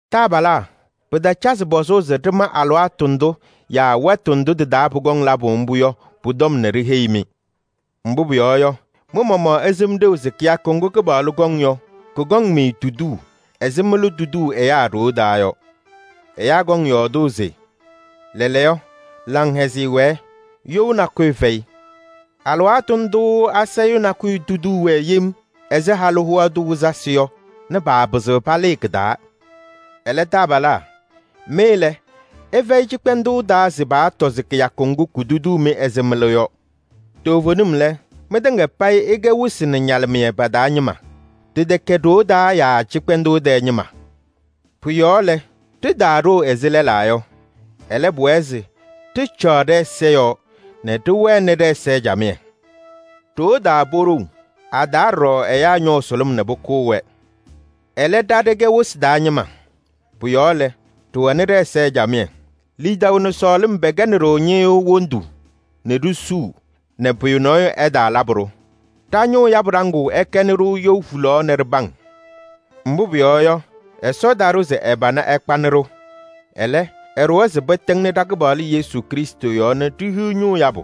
Taabalaa! Pɩtacazɩ pɔzʋʋ se ɖɩma alɩwaatʋ ndʋ yaa wɛtʋ ndʋ tɩ-taa pʋkɔŋ labʋ mbʋ yɔ, pʋ-tɔm nɛ ɖiheyi-mɩ. Mbʋ pʋyɔɔ yɔ, mɩ-maɣmaɣ ɩsɩm ɖeu se kɩyakʋ ŋgʋ Kɩpaɣlʋ kɔŋ yɔ, kʋkɔŋ-mɩ tuduu ɛzɩ mɩlʋ tuduu ɛyaa ɖoo taa yɔ. Ɛyaa kɔŋ yɔɔdʋʋ se: “Lɛɛlɛɛyɔ, laŋhɛzɩyɛ wɛɛ, you nakʋyʋ fɛyɩ!” Alɩwaatʋ ndʋʋ asayʋʋ nakʋyʋ tuduu-wɛ yem ɛzɩ halʋ hoa tʋ wɩzasɩ yɔ nɛ paapɩzɩɣ palɩɩ kɩ-taa. Ɛlɛ, taabalaa! Mɩ lɛ, ɩfɛyɩ cɩkpɛndʋʋ taa se paatɔ se kɩyakʋ ŋgʋ kutuduu-mɩ ɛzɩ mɩlʋ yɔ. Toovenim lɛ, mɩtɩŋa payɩ ɩkɛ wɩsɩ nɛ ñalɩmɩyɛ pa-taa ñɩma. Ɖɩtɛkɛ ɖoo taa yaa cɩkpɛndʋʋ tɛɛ ñɩma. Pʋ-yɔɔ lɛ, ɖitaaɖoo ɛzɩ lɛlaa yɔ. Ɛlɛ, pʋwɛɛ se ɖɩcaɣ ɖɛ-ɛza yɔɔ nɛ ɖɩwɛnɩ ɖɛ-ɛza camɩyɛ. Ɖoo taa poɖou, a-taa ɖɔɖɔ ɛyaa ñɔʋ sʋlʋm nɛ pʋkʋʋ-wɛ. Ɛlɛ, ɖa ɖɛkɛ wɩsɩ taa ñɩma. Pʋ-yɔɔ lɛ, ɖɩwɛnɩ ɖɛ-ɛza camɩyɛ. Lidaʋ nɛ sɔɔlɩm pɛkɛnɩ-ɖʋ ñɩɣyʋʋ wondu nɛ ɖisuu nɛ pʋyʋ nɔɔyʋ ɛtaalabɩ-ɖʋ. Ɖa-ñʋʋ yabʋ ɖaŋʋʋ ɛkɛnɩ-ɖʋ you hulaɣ nɛ ɖɩpaŋ. Mbʋ pʋyɔɔ yɔ, Ɛsɔ taɖʋ se ɛ-pana ɛkpanɩ-ɖʋ, ɛlɛ, ɛɖʋwa se pɩtɩŋnɩ ɖa-Kɩpaɣlʋ Yesu Krɩstʋ yɔɔ nɛ ɖihiɣ ñʋʋ yabʋ.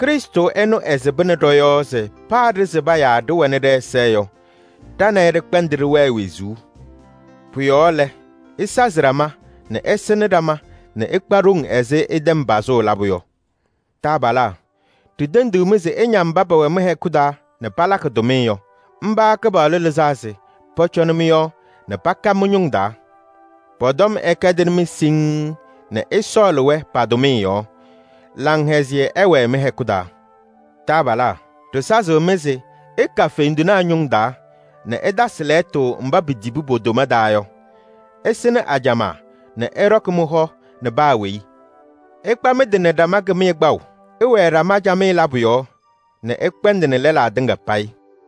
Krɩstʋ ɛnʋ ɛsɩbɩnɩ ɖɔ-yɔɔ se paa ɖɩsɩba yaa ɖɩwɛnɩ ɖɛ-ɛza yɔ, ɖa nɛ ɩ ɖɩkpɛndɩ ɖɩwɛɛ wezuu. Pʋ-yɔɔ lɛ, ɩsazɩ ɖama nɛ ɩsɩnɩ ɖama nɛ ɩkpa ɖoŋ ɛzɩ ɩtɛm pazʋʋ labʋ yɔ. Taabalaa! Ɖitendiɣ-mɩ se ɩña mba pɛwɛ mɩ-hɛkʋ taa nɛ palakɩ tʋmɩyɛ yɔ. Mba Kɩpaɣlʋ lɩzaa se pɔcɔnɩ mɩ-yɔɔ nɛ paka mɩ-ñʋŋ taa. Pɔ-tɔm ɛkɛdɩnɩ-mɩ siŋŋ nɛ ɩsɔɔlɩ-wɛ pa-tʋmɩyɛ yɔɔ. Laŋhɛzɩyɛ ɛwɛɛ mɩ-hɛkʋ taa. Taabalaa! Ɖɩsazɩɣ-mɩ se ɩka fendinaa ñʋŋ taa nɛ ɩtasɩ tɔm mba pitibi po-toma taa yɔ. Ɩsɩnɩ ajamaa nɛ ɩɖɔkɩ mɩ-hɔ nɛ paa weyi. Ɩkpa mɩ-tɩ nɛ ɖama kɩmɩyɛ kpaʋ. Ɩwɛɛ ɖama camɩyɛ labʋ yɔɔ nɛ ɩkpɛndɩnɩ lɛlaa tɩŋa payɩ.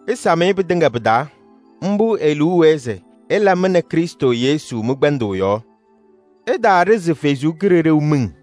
Ɩsam-ɩ pɩtɩŋa pɩ-taa, mbʋ e-liu wɛɛ se ɩla mɩ nɛ Krɩstʋ Yesu mɩ-kpɛndʋʋ yɔɔ. Ɩtaaɖizi Ɛsɔ Kalɩzaɣ miŋ.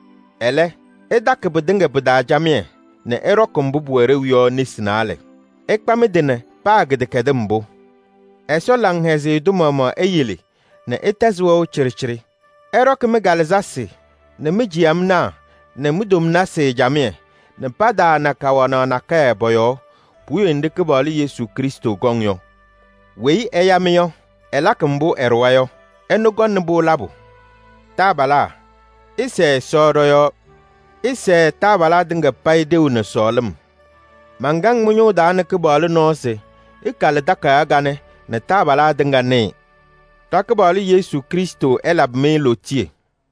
Ɛlɛ, ɩtakɩ pɩtɩŋa pɩ-taa camɩyɛ nɛ ɩɖɔkɩ mbʋ pʋwɛ ɖeu yɔ nesi naalɛ. Ɩkpa mɩ-tɩ nɛ paa kɩdɛkɛdɩm mbʋ. Ɛsɔ laŋhɛzɩyɛ tʋ maɣmaɣ eyele nɛ ɩtɛzɩ wɛʋ cɩɖɩcɩɖɩ. Ɛɖɔkɩ mɩ-kalɩzasɩ nɛ mi-ciyamnaa nɛ mi-tomnasɩ camɩyɛ nɛ pataana kawanaɣ nakɛyɛ pɔ-yɔɔ puwiye nɖɩ Kɩpaɣlʋ Yesu Krɩstʋ kɔŋ yɔ. Weyi ɛya-mɩ yɔ, ɛlakɩ mbʋ ɛɖʋwa yɔ: ɛnʋ kɔŋnɩ-pʋ labʋ. Taabalaa! Ɩsɛɛ Ɛsɔ ɖɔ-yɔɔ. Ɩsɛɛ taabalaa tɩŋa payɩ ɖeu nɛ sɔɔlɩm. Mankaŋ mɩ-ñʋʋ taa nɛ Kɩpaɣlʋ nɔɔ se ɩkalɩ takayaɣ kanɛ nɛ taabalaa tɩŋa nɩɩ. Ɖa-Kɩpaɣlʋ Yesu Krɩstʋ ɛlabɩ-mɩ lootiye!